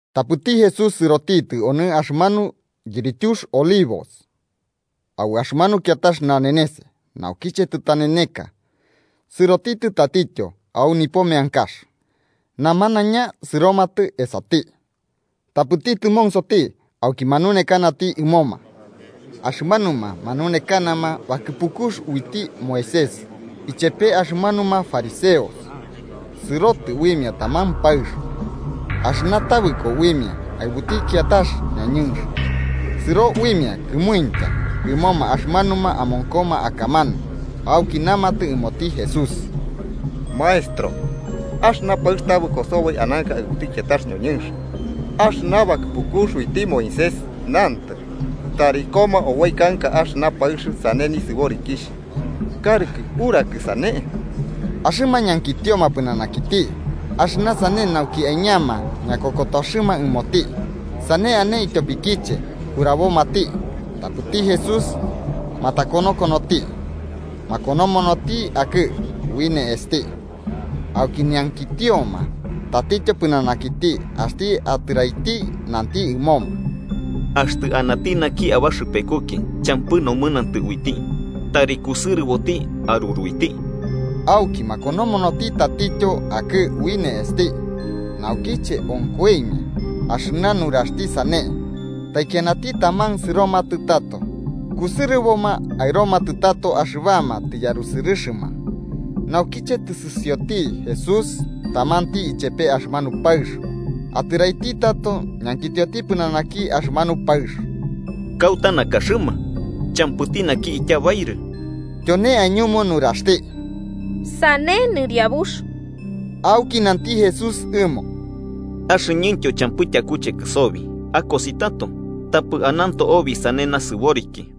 Tapɨti Jesús sɨrotitɨ onɨ axɨmanu yirityux Olivos, au axɨmanu kiatax nanenes, naukiche tɨtaneneka, sɨrotitɨ tatityo au nipo meankax. Namanaiña sɨromatɨ esati, tapɨti tɨmonsoti auki manunekanati ɨmoma. Axɨmanuma manunekanama bakɨpukux uiti Moisés ichepe axɨmanuma fariseos sɨrotɨ uimia taman paɨx, axɨna tabɨko uimia aɨbuti kiatax ñoñɨnx. Sɨro uimia kɨmuintya ɨmoma axɨmanuma amonkoma akamanu, auki namatɨ ɨmoti Jesús: –Maestro, axɨna paɨx tabɨko soboi ananka aɨbuti kiatax ñoñɨnx. Axɨna bakɨpukux uiti Moisés nantɨ, tari koma oboi kanka axɨna paɨx sane nisɨborikixh. ¿Karɨkɨ urakɨ sane? Axɨma ñankitioma pɨnanakiti axɨna sane nauki aiñama ñakokotoxɨma ɨmoti, sane ane ityopikiche urabomati. Tapɨti Jesús matakonokonoti, makonomonoti akɨ ui ne'esti. Auki ñankitioma tatityo pɨnanakiti, axti atɨraiti, nanti ɨmoma: –Axtɨ anati naki abaxɨpekuki champɨ nomɨnantɨ uiti, tari kusɨrɨboti aruruiti. Auki makonomonoti tatityo akɨ ui ne'esti. Naukiche onkoimia axɨna nuraxti sane, taikianati taman sɨromatɨ tato, kusɨrɨboma aɨromatɨ tato axɨbama tɨyarusɨrɨma. Naukiche tɨsɨsioti Jesús tamanti ichepe axɨmanu paɨx, atɨraiti tato ñankitioti pɨnanaki axɨmanu paɨx: –¿Kauta nakaxɨma? ¿Champɨti naki ityabairɨ? Tyone aiñumu nuraxti: –Sane, Nɨriabux. Auki nanti Jesús ɨmo: –Axɨñɨntyo champɨ tyakuchekɨ sobi. Akosi tato, tapɨ ananto obi sane nasɨboriki.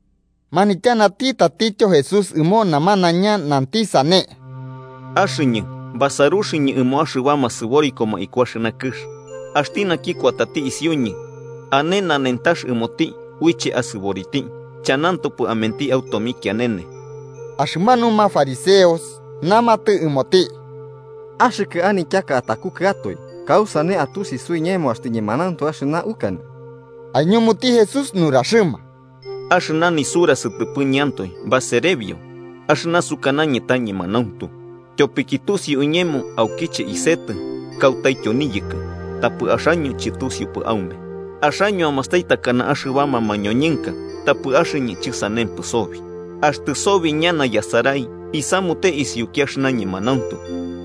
Manityanati tatityo Jesús ɨmo namanaiña, nanti sane: –Axɨñɨ basaruxɨñɨ ɨmo axɨbama sɨborikoma iku axɨna kɨx. Axti naki kuatati isiuñɨ, ane nanentax ɨmoti uiche asɨboriti, chanantopɨ amenti au tomikianene. Axɨmanuma fariseos namatɨ ɨmoti: –Axɨkɨ anityaka atakukɨatoe, ¿kausane atusi suiñemo axtɨ ñemanauntu axɨna ukanɨ? Aiñumuti Jesús nuraxɨma: –Axɨna nisura sɨtɨpɨñɨantoe baserebio, axɨna sukanañɨ ta ñemanauntu. Tyopiki tusiu iñemo aukiche isetɨ kautaityo niyɨkɨ. Tapɨ axaño chɨtusiupɨ aume. Axaño amastai takana axɨbama mañoñɨnka tapɨ axɨñɨ chɨsanempɨ sobi. Axtɨ sobi ñana yasarai, isamute isiuki axɨna ñemanauntu,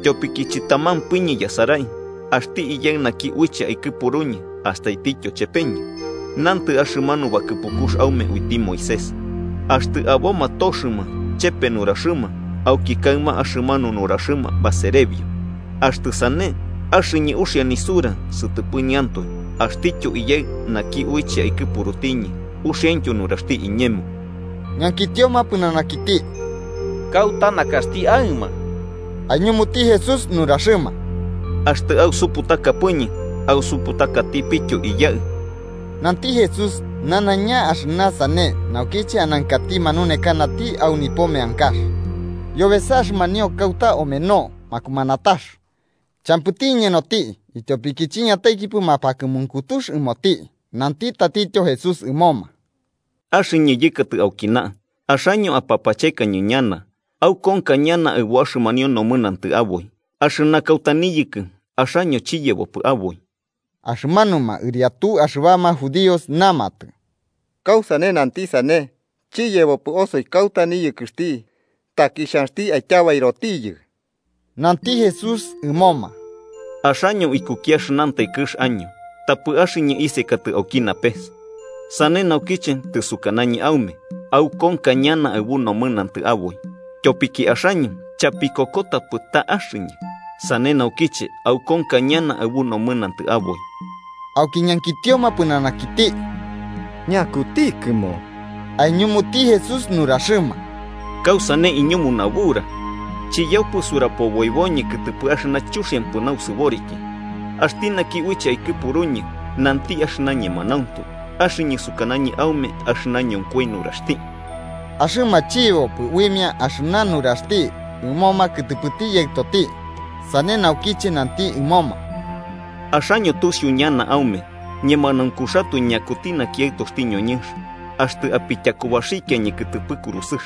tyopiki chɨtamampɨñɨ yasarai, axti Iyaɨ naki uiche aikɨpuruñɨ astaitityo chepeñɨ. Nantɨ axɨmanu bakɨpukux aume uiti Moisés, axtɨ aboma toxɨma chepe nuraxɨma, auki kaɨma axɨmanu nuraxɨma baserebio. Axtɨ sane, axɨñɨ uxia nisura sɨtɨpɨñɨantoe, axtityo Iyaɨ naki uiche aikɨpurutiñɨ, uxiaintyo nuraxti iñemo. Ñankitioma pɨnanakiti –¿Kauta nakaxti aɨma? Aiñumuti Jesús nuraxɨma: –Axtɨ ausuputakapɨñɨ, ausuputakatipityo Iyaɨ. Nanti Jesús nanaiña axɨna sane naukiche anankati manunekanati au nipo meankax, yobesa axɨmanio kauta omeno makumanatax. Champɨti iñenoti, ityopiki chiñataikipɨ mapakɨmunkutux ɨmoti. Nanti tatityo Jesús ɨmoma: –Axɨñɨ yɨkatɨ aukina, axaño apapachekañɨ ñana, aukonka ñana aɨbu axɨmanio nomɨnantɨ aboi. Axɨna kauta niyɨkɨ, axaño chiyebopɨ aboi. Axɨmanuma ɨriatu axɨbama judíos namatɨ: –¿Kausane nanti sane chiyebopɨ osoi kauta niyɨkɨxti? ¿Taki xhanxti aityabairotiyɨ? Nanti Jesús ɨmoma: –Axaño ikuki axɨnantai kɨx año, tapɨ axɨñɨ isekatɨ auki napes. Sane naukiche tɨsukanañɨ aume aukonka ñana aɨbu nomɨnantɨ aboi. Tyopiki axaño chapikokotapɨ ta Axɨñɨ, sane naukiche aukonka ñana aɨbu nomɨnantɨ aboi. Auki ñankitioma pɨnanakiti: –¿Ñakutikɨmo? Aiñumuti Jesús nuraxɨma: –¿Kausane iñumu nabura? Chiyaupɨ surapoboiboñɨ kɨtɨpɨ axɨna chuxiampɨ nausɨboriki. Axti naki uiche aikɨpuruñɨ nanti axɨna ñemanauntu, axɨñɨ sukanañɨ aume axɨna ñonkoi nuraxti. Axɨma chiyebopɨ uimia axɨna nuraxti ɨmoma kɨtɨpɨti Yaɨtoti. Sane naukiche nanti ɨmoma: –Axaño tusiu ñana aume ñemanaunkuxatoe ñakuti naki Aɨtoxti ñoñɨnx, axtɨ apityakubaxikiañɨ kɨtɨpɨ kurusɨx.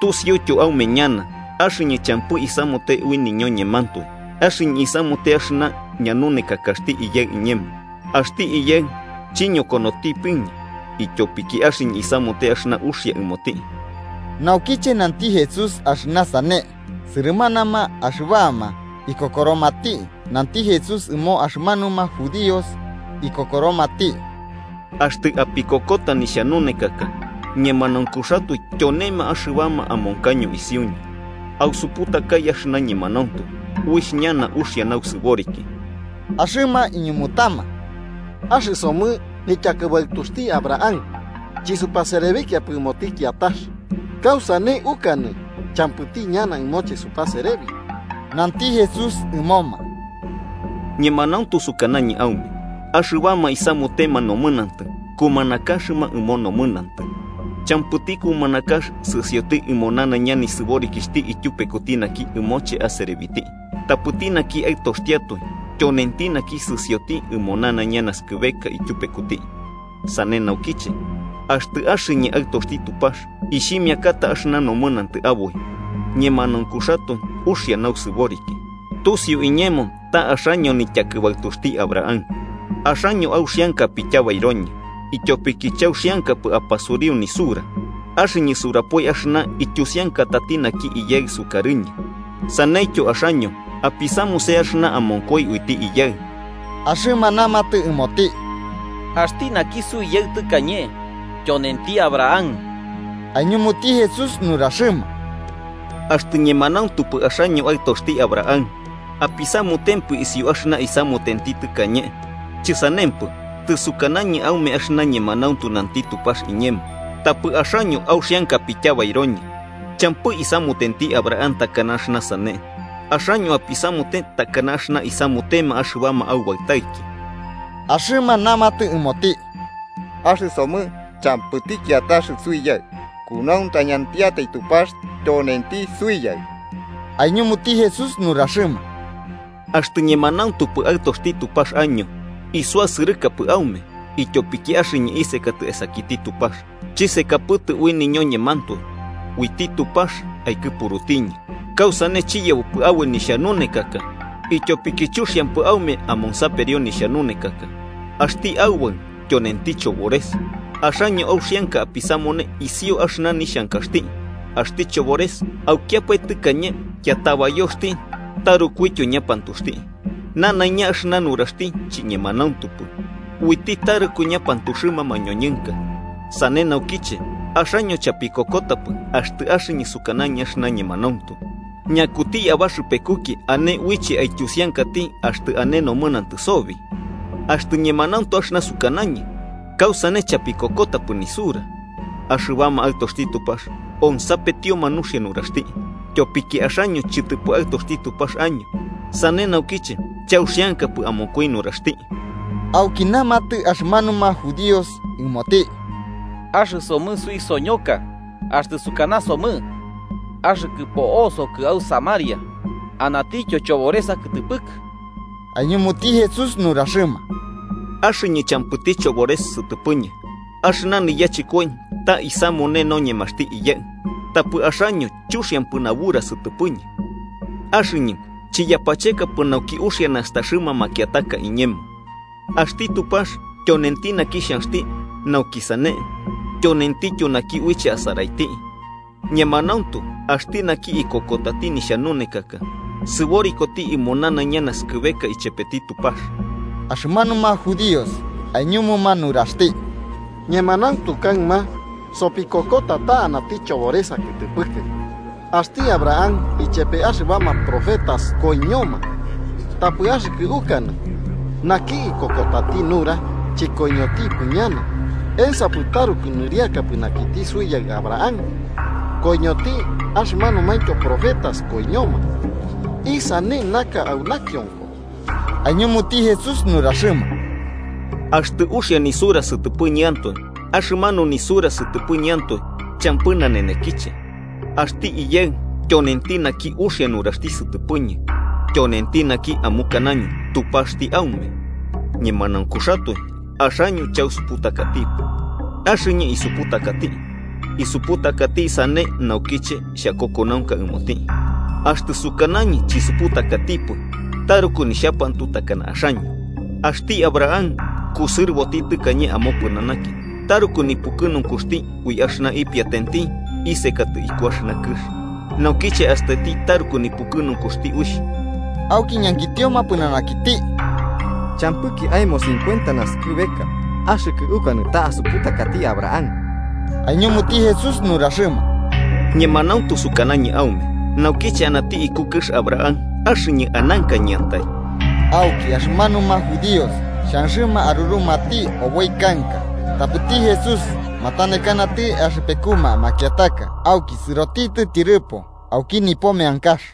Tusiuityo aume ñana axɨñɨ champɨ isamute ui niñoñemantoe, axɨñɨ isamute axɨna ñanunekakaxti Iyaɨ iñemo. Axti Iyaɨ chiñokonotiñɨpɨ, ityopiki axɨñɨ isamute axɨna uxia ɨmoti. Naukiche nanti Jesús axɨna sane, sɨrɨmanama axɨbama ikokoromati. Nanti Jesús ɨmo axɨmanuma judíos ikokoromati: –Axtɨ apikokota nihxanunekaka, ñemanaunkuxatoe tyonema axɨbama amonkaño isiuñɨ. Ausuputakai axɨna ñemanauntu, uixh ñana uxia nausɨboriki. Axɨma iñumutama: –Axɨsomɨ nityakɨbaɨtuxti Abraham, chɨsupaserebikiapɨ ɨmoti kiatax. ¿Kausane ukanɨ champɨti ñana ɨmoche supaserebi? Nanti Jesús ɨmoma: –Ñemanauntu sukanañɨ aume axɨbama isamutema nomɨnantɨ, kumanakaxɨma ɨmo nomɨnantɨ. Champɨti kumanakax sɨsioti ɨmo nanaiña nisɨborikixhti ityupekuti naki ɨmoche aserebiti. Tapɨti naki aɨtoxtiatoe tyonenti naki sɨsioti ɨmo nanaiña naskɨbeka ityupekuti. Sane naukiche, axtɨ axɨñɨ Aɨtoxti Tupax, ixhimiakata axɨna nomɨnantɨ aboi, ñemanaunkuxatoe uxia nausɨboriki. Tusiu iñemo ta axaño nityakɨbaɨtuxti Abraham. Axaño auxianka apityabairoñɨ ityopiki chauxiankapɨ apasuriu nisura. Axɨñɨ surapoi axɨna ityusiankatati naki Iyaɨ sukarɨñɨ. Saneityo axaño apisamuse axɨna amonkoi uiti Iyaɨ. Axɨma namatɨ ɨmoti: –¡Axti naki suiyaɨ tɨkañe, tyonenti Abraham! Aiñumuti Jesús nuraxɨma: –Axtɨ ñemanauntupɨ axaño aɨtoxti Abraham, apisamutempɨ isiu axɨna isamutenti tɨkañe. Chɨsanempɨ, tɨsukanañɨ aume axɨna ñemanauntu nanti Tupax iñemo, tapɨ axaño auxianka apityabairoñɨ. ¡Champɨ isamutenti Abraham takana axɨna sane! Axaño apisamute takana axɨna isamutema axɨbama aubaɨtaiki. Axɨma namatɨ ɨmoti: –¡Axɨsomɨ champɨti kiatax suiyaɨ, kunauntañatiatai Tupax tyonenti Suiyaɨ! Aiñumuti Jesús nuraxɨma: –Axtɨ ñemanauntupɨ aɨtoxti Tupax año, isuasɨrɨkapɨ aume, ityopiki axɨñɨ isekatɨ esakiti Tupax. Chisekapɨtɨ ui niñoñemantoe, uiti Tupax aikɨpurutiñɨ. ¿Kausane chiyebopɨ aboi nixhanunekaka? Ityopiki chuxiampɨ aume amonsaperio nixhanunekaka. Axti aubaɨ tyonenti chobores. Axaño auxianka apisamune isiu axɨna nixhankaxti. Axti chobores aukiapae tɨkañe yatabayoxti tarukuityo ñapantuxti. Nanaiña axɨna nuraxti chiñemanauntupɨ, uiti taruku ñapantuxɨma mañoñɨnka. Sane naukiche axaño chapikokotapɨ axtɨ axɨñɨ sukanañɨ axɨna ñemanauntu. ¿Ñakuti abaxɨpekuki ane uiche aityusiankati axtɨ ane nomɨnantɨ sobi? Axtɨ ñemanauntu axɨna sukanañɨ, ¿kausane chapikokotapɨ nisura? Axɨbama aɨtoxti Tupax onsapetioma nuxia nuraxti. Tyopiki axaño chɨtɨpɨ aɨtoxti Tupax año, sane naukiche chauxiankapɨ amonkoi nuraxti. Auki namatɨ axɨmanuma judíos ɨmoti: –Axɨsomɨ suisoñoka axtɨ sukanasomɨ axɨkɨ po'osokɨ au samaria anatityo chobores akɨtɨpɨkɨ. Aiñumuti Jesús nuraxɨma: –Axɨñɨ champɨti chobores sɨtɨpɨñɨ. Axɨna niyachɨkoi ta isamune noñemaxti Iyaɨ. Tapɨ axaño chuxiampɨ nabura sɨtɨpɨñɨ. Axɨñɨ chiyapachekapɨ nauki uxia nastaxɨma makiataka iñemo. Axti Tupax tyonenti naki xhanxti nauki sane, tyonentityo naki uiche asaraiti. Ñemanauntu axti naki ikokotati nixhanunekaka, sɨborikoti ɨmo nanaiña naskɨbeka ichepeti Tupax. Axɨmanuma judíos aiñumuma nuraxti: –Ñemanauntu kaɨma sopikokota ta anati chobores akɨtɨpɨkɨ. Axti Abraham ichepe axɨbama profetas koiñoma, tapɨ axɨkɨ ukanɨ: ‘Naki ikokotati nura chɨkoiñotipɨ ñana.’ ¿Ensapɨ taruku nɨriaka pɨnanakiti suiyaɨ Abraham? Koiñoti, axɨmanumaintyo profetas koiñoma. ¿Isane naka au nakionko? Aiñumuti Jesús nuraxɨma: –Axtɨ uxia nisura sɨtɨpɨñɨantoe, axɨmanu nisura sɨtɨpɨñɨantoe champɨ nanenekiche. Axti Iyaɨ tyonenti naki uxia nuraxti sɨtɨpɨñɨ, tyonenti naki amukanaño Tupaxti aume. Ñemanaunkuxatoe, axaño chausuputakatipɨ. Axɨñɨ isuputakati. Isuputakati sane naukiche xhakokonaunka ɨmoti. Axtɨ sukanañɨ chisuputakatipɨ, taruku nixhapantu takana axaño. Axti Abraham, kusɨrɨboti tɨkañe amopɨnanaki taruku nipukɨnunkuxti ui axɨna ipiatenti isekatɨ iku axɨna kɨx. Naukiche astaiti taruku nipukɨnunkuxti uixh. Auki ñankitioma pɨnanakiti: –Champɨki aemo cincuenta nasɨkɨbeka, ¿axɨkɨ ukanɨ ta asuputakati Abraham? Aiñumuti Jesús nuraxɨma: –Ñemanauntu sukanañɨ aume naukiche anati iku kɨx Abraham axɨñɨ anankañɨantai. Auki axɨmanuma judíos xhanxɨma arurumati oboi kanka. Tapɨti Jesús matanekanati axɨpekuma makiataka auki sɨrotitɨ tyɨrɨpo auki nipo meankax.